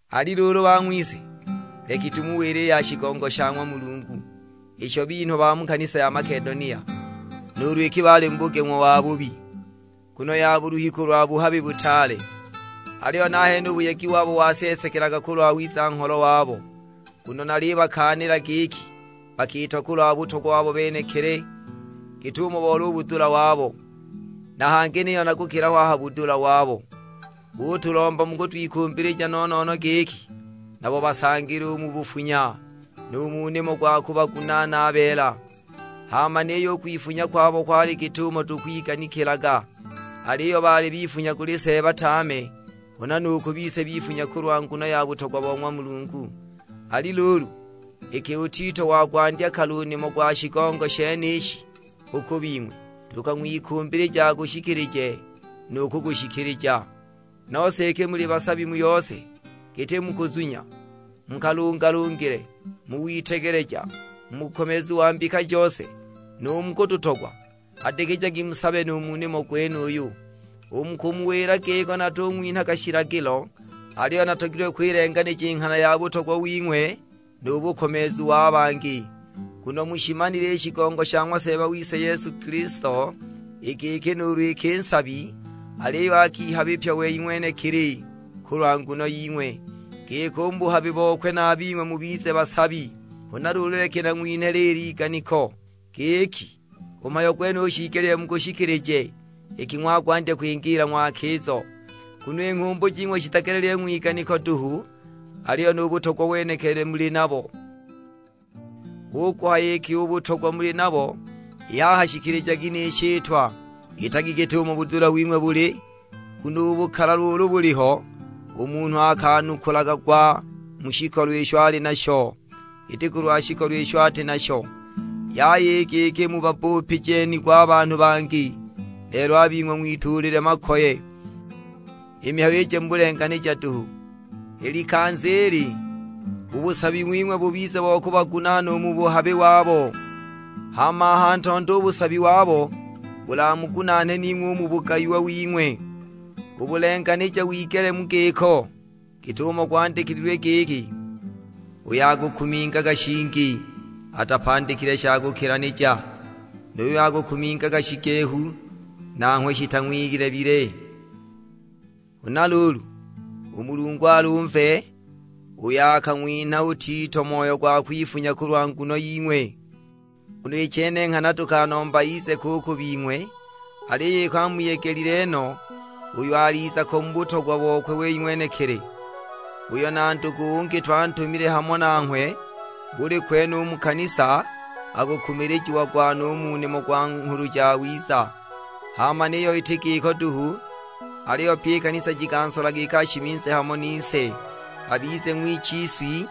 Ali luulu bang'wise, leki tumuwile i ya shigongo sha ng'wa Mulungu, isho binhwa ba mu kanisa ja Makedonia. Nuulu iki baali mu bugeng'wa wabubi, nguno ya buluhi kulwa buhabi butaale, aliyo nahene u buyegi wabo waseesekelaga kulwa wiza-ngholo wabo. Nguno nalibakaanila giki bakiita kulwa butogwa wabo benekili; git'umo boli u budula wabo, na hangi niyo na kukila ho a ha budula wabo. Butulomba mu kutwikumbilija no-no-no giki nabo basangile u mu bufunya, nu mu nimo gwa kubagunaana a beela. Hama niyo u kwifunya kwabo kwali kuti git'umo twiganikilaga, aliyo baali bifunya kuli Seeba tame, huna nu ku bise bifunya kulwa nguno ya butogwa bo ng'wa Mulungu. Ali luulu, iki u Tito wagwandya kale u nimo gwa shigongo shenishi u ku bing'we, tukang'wikumbilija agushikilije nu kugushikilija. Nose iki muli basabi mu yose: giti mu kuzunya, mu kalungalungile, mu witegeleja, mu bukomeezu wa mbika jose, nu mu kututogwa; hadikijagi musabe nu mu nimo gwenuyu. U mu kumuwila giko natung'winhaga shilagilo, aliyo natogilwe kwilenganija i nghana ya butogwa wing'we nu bukomeezu wa bangi. Nguno mushimanile i shigongo sha ng'wa Seeba wise Yesu Kilisto, i giki nuulu iki nsabi, aliyo akihabipya wei ng'wenekili kulwa nguno ying'we, giki u mu buhabi bokwe a bing'we mubize basabi. Huna luulu leki nang'winhe liili iganiko; giki, u mhayo gwenuyu shiigelile mugushikilije iki ng'wagwandya kwingiila ng'wakizo; nguno i nghumbu jing'we jitagelelile ng'wiganiko duhu, aliyo nu butogwa wenekili muli nabo. Hu kuhaya iki u butogwa muli nabo, i haha shikilijagi ni shitwa, itagi git'umo budula wing'we buli. Nguno u bukalalwa ulu buliho, u munhu akanukulagwa mu shikolo isho ali nasho, iti kulwa shikolo isho ati nasho. Yaya i giki mubabbupije nigo banhu bangi, lelo a bing'we ng'wituule mu makoye; i mihayo ije mu bulenganija duhu. I likanza ili, u busabi wing'we bubize bo kubagunaana u mu buhabi wabo, hama a ha ntondo u busabi wabo bulamugunaane ning'we u mu bugayiwa wing'we; u bulenganija wigele mu giko. Git'umo gwandikilwe giki, "Uyo akakuminga shingi atapandikile sha kukilanija, nu yuyo akakuminga shigehu nanghwe shitang'wilebile." Huna luulu, u Mulungu alumve, uyo akang'winha u Tito moyo gwa kwifunya kulwa nguno ying'we. Nguno i chene nghana tukanomba ize ko u ku bing'we, aliyo iki amuyegelile no, uuyo aliza ko mu butogwa bokwe wei ng'wenekili. Uuyo na ndugu ungi twantumile hamo nanghwe, buli kwene u mu kanisa akukumilijiagwa no u mu nimo gwa Nghulu Jawiza. Hama niyo iti giko duhu, aliyo pyi i kanisa jikansola giki ashimize hamo nise, abize ng'wichiswi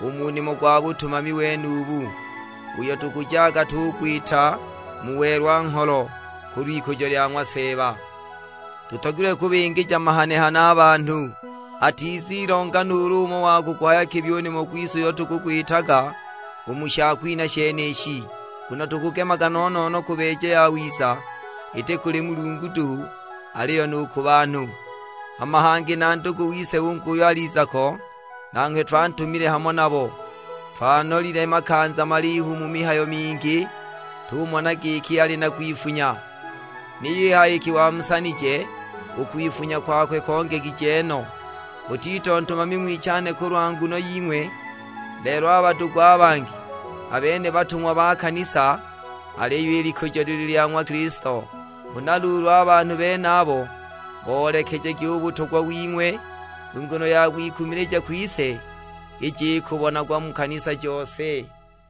u mu nimo gwa butumami wenubu, uyo tukujaga tugwita mu welwa-ngholo kulw'ikujo lya ng'wa Seeba. Tutogilwe kubingija mahane-hane a banhu, atizigela nuulu umo wa kuguhaya kibi u nimo gwise uyo tukugwitaga u mu shakwinha shenishi. Nguno tukugemaga no-no-no kubeeja yawiza, iti kuli Mulungu duhu, aliyo nu ku banhu. Hama hangi na ndugu wise ungi uuyo aliza ko, nanghwe twantumile hamo nabo. Twanolile makanza malihu mu mihayo mingi, tumona giki ali na kwifunya; niyo i haha iki wamusanije, u kwifunya kwakwe kongegije no. U Tito ntumami ng'wichane kulwa nguno ying'we, lelo a badugu a bangi, a bene batung'wa ba kanisa, aliyo i likujo lili lya ng'wa Kilisto! Huna luulu a banhu benabo boolekejagi u butogwa wing'we, i nguno ya kwikumilija kwise ije ikubonagwa mu kanisa jose.